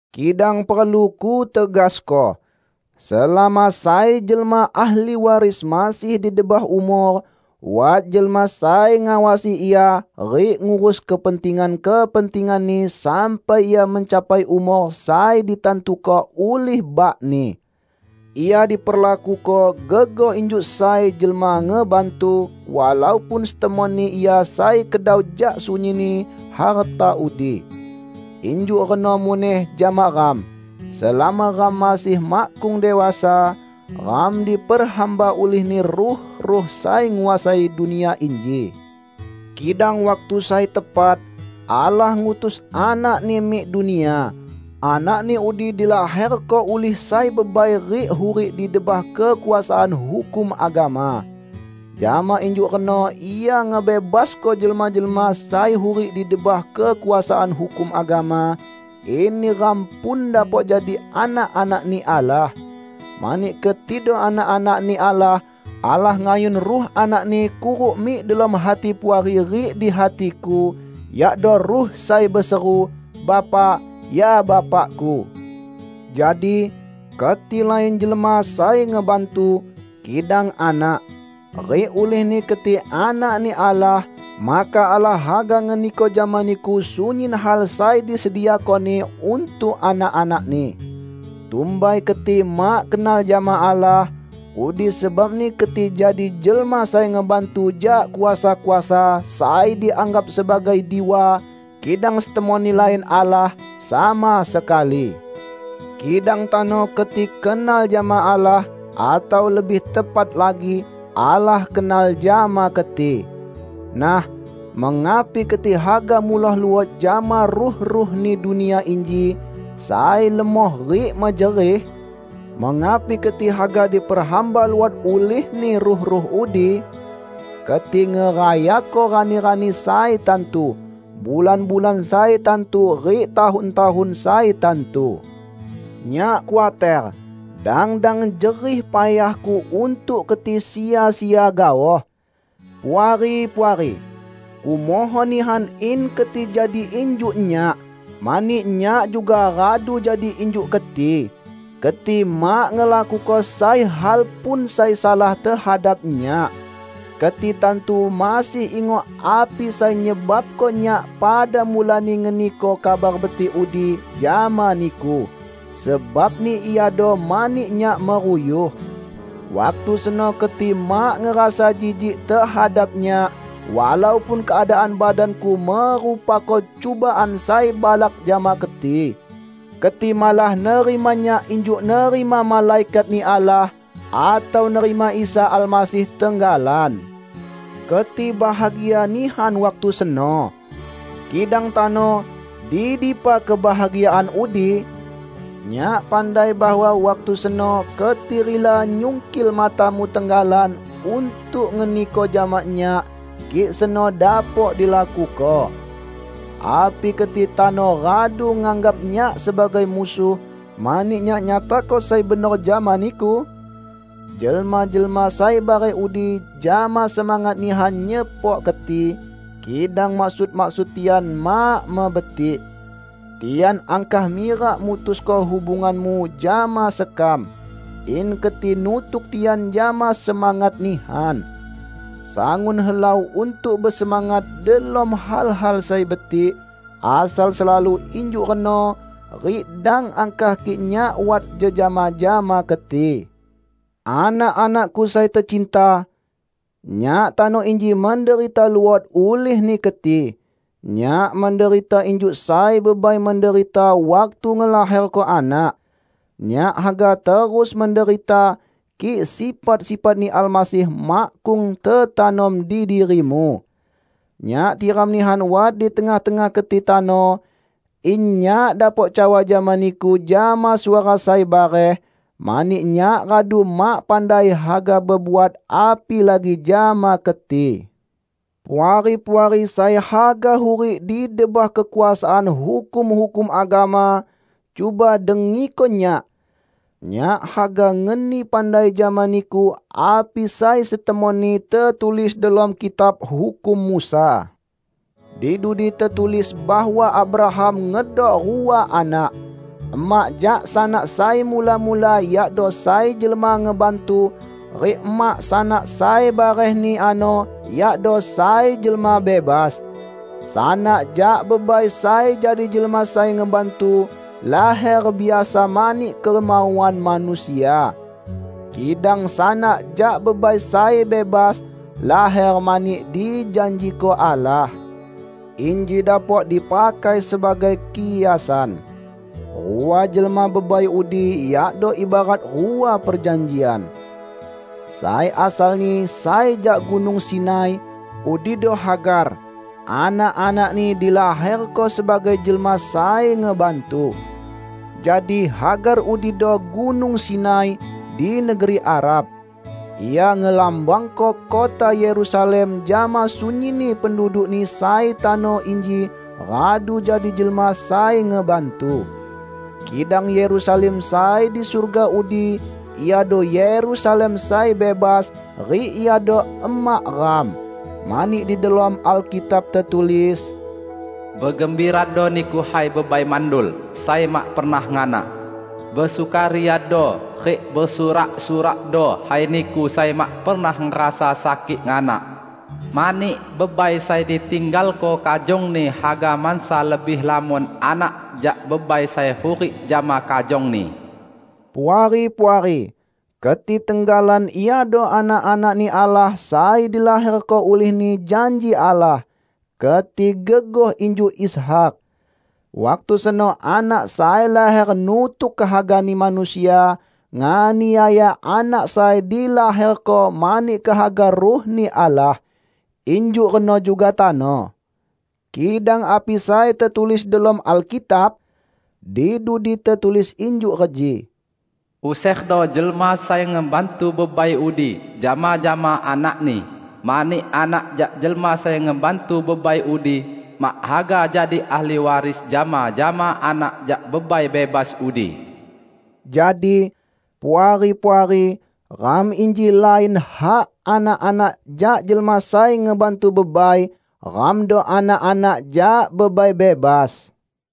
Kidang perlu kutegasko: selama sai jelma ahli waris masih di debah umor, wat jelma sai ngawasi ia rik ngurus kepentingan-kepentinganni sampai ia mencapai umor sai ditantuko ulih bakni. Ia diperlakuko gegoh injuk sai jelma ngebantu, walaupun setemonni ia sai kedau jak sunyinni harta udi. Injuk reno muneh jama ram: Selama ram masih makkung dewasa, ram diperhamba ulihni ruh-ruh sai nguasai dunia inji. Kidang waktu sai tepat, Allah ngutus Anak-Ni mik dunia. Anak-Ni udi dilaherko ulih sai bebai rik hurik di debah kekuasaan hukum agama. Jama injuk reno Ia ngebebasko jelma-jelma sai hurik di debah kekuasaan hukum agama; in neram pun dapok jadi anak-anak-Ni Allah. Mani ketido anak-anak-Ni Allah, Allah ngayun Ruh Anak-Ni kuruk mik delom hati Puari rik di hatiku, yakdo Ruh sai beseru, "Bapa, ya Bapaku." Jadi, keti lain jelma sai ngebantu, kidang anak. Rik ulihni keti anak-Ni Allah, maka Allah haga ngeniko jama niku sunyin hal sai disediako-Ni untuk anak-anak-Ni. Tumbai keti mak kenal jama Allah, udi sebabni keti jadi jelma sai ngebantu jak kuasa-kuasa sai dianggap sebagai diwa kidang setemonni lain Allah sama sekali. Kidang tano keti kenal jama Allah, atau lebih tepat lagi, Allah kenal jama keti. Nah, mengapi keti haga muloh luot jama ruh-ruhni dunia inji, sai lemoh rik mejerih? Mengapi keti haga diperhamba luot ulihni ruh-ruh udi? Keti ngerayako rani-rani sai tantu, bulan-bulan sai tantu rik tahun-tahun sai tantu. Nyak khuater, dang-dang jerih payahku untuk keti sia-sia gaoh. Puari-puari! Kumohon nihan in keti jadi injuk nyak. Mani nyak juga radu jadi injuk keti. Keti mak ngelakuko sai hal pun sai salah tehadap nyak. Keti tantu masih ingok api sai nyebabko nyak pada mulani ngeniko Kabar Betik udi jama niku. Sebabni iado mani nyak meruyuh. Waktu seno keti mak ngerasa jijik tehadap nyak, walaupun keadaan badanku merupako cubaan sai balak jama keti. Keti malah nerima nyak injuk nerima malaikat-Ni Allah atau nerima Isa Almasih tenggalan. Keti bahagia nihan waktu seno. Kidang tano, di dipa kebahagiaan udi? Nyak pandai bahwa waktu seno keti rila nyungkil matamu tenggalan untuk ngeniko jama nyak, kik seno dapok dilakuko. Api keti tano radu nganggap nyak sebagai musuh, mani nyak nyatako sai benor jama niku? Jelma-jelma sai bareh udi jama semangat nihan nyepok keti, kidang maksud-maksud tian mak mebetik. Tian angkah mirak mutusko hubunganmu jama sekam, in keti nutuk tian jama semangat nihan. Sangun helau untuk besemangat delom hal-hal sai betik, asal selalu injuk reno rik dang angkah kik nyak wat jejama jama keti. Anak-anakku sai tecinta! Nyak tano inji menderita luot ulihni keti. Nyak menderita injuk sai bebai menderita waktu ngelaherko anak. Nyak haga terus menderita, kik sifat-sifat-Ni Almasih makkung tetanom di dirimu. Nyak tiram nihan wat di tengah-tengah keti tano, in nyak dapok cawa jama niku jama suara sai bareh, mani nyak radu mak pandai haga bebuat apilagi jama keti. Puari-puari sai haga hurik di debah kekuasaan hukum-hukum agama, cuba dengiko nyak! Nyak haga ngeni pandai jama niku api sai setemonni tetulis delom Kitab Hukum Musa. Di dudi tetulis bahwa Abraham ngedok rua anak: Emak jak sanak sai mula-mula yakdo sai jelma ngebantu, rik emak sanak sai barehni ano yakdo sai jelma bebas. Sanak jak bebai sai jadi jelma sai ngebantu laher biasa mani kemauan manusia. Kidang sanak jak bebai sai bebas, laher mani dijanjiko Allah. Inji dapok dipakai sebagai kiasan. Rua jelma bebai udi yakdo ibarat rua perjanjian: sai asalni sai jak Gunung Sinai -- udido Hagar; anak-anakni dilaherko sebagai jelma sai ngebantu. Jadi, Hagar udido Gunung Sinai, di negeri Arab. Ia ngelambangko kota Yerusalem jama sunyinni pendudukni sai tano inji radu jadi jelma sai ngebantu. Kidang Yerusalem sai di surga udi iado Yerusalem sai bebas, rik iado emak ram. Mani di delom Alkitab tetulis, "Begembirado niku hai bebai mandul, sai mak pernah nganak! Besukariado rik besurak-surakdo hai niku sai mak pernah ngerasa sakik nganak! Mani bebai sai ditinggalko kajongni haga mansa lebih lamon anak jak bebai sai hurik jama kajongni." Puari-puari! Keti tenggalan iado anak-anak-Ni Allah sai dilaherko ulihni janji Allah; keti gegoh injuk Ishak. Waktu seno anak sai laher nutuk kehagani manusia, nganiaya anak sai dilaherko mani kehaga Ruh-Ni Allah. Injuk reno juga tano. Kidang api sai tetulis delom Alkitab? Di dudi tetulis injuk reji: "Userdo jelma sai ngebantu bebai udi jama-jama anakni, mani anak jak jelma sai ngebantu bebai udi mak haga jadi ahli waris jama-jama anak jak bebai bebas udi." Jadi, Puari-puari, ram inji lain hak anak-anak jak jelma sai ngebantu bebai; ramdo anak-anak jak bebai bebas.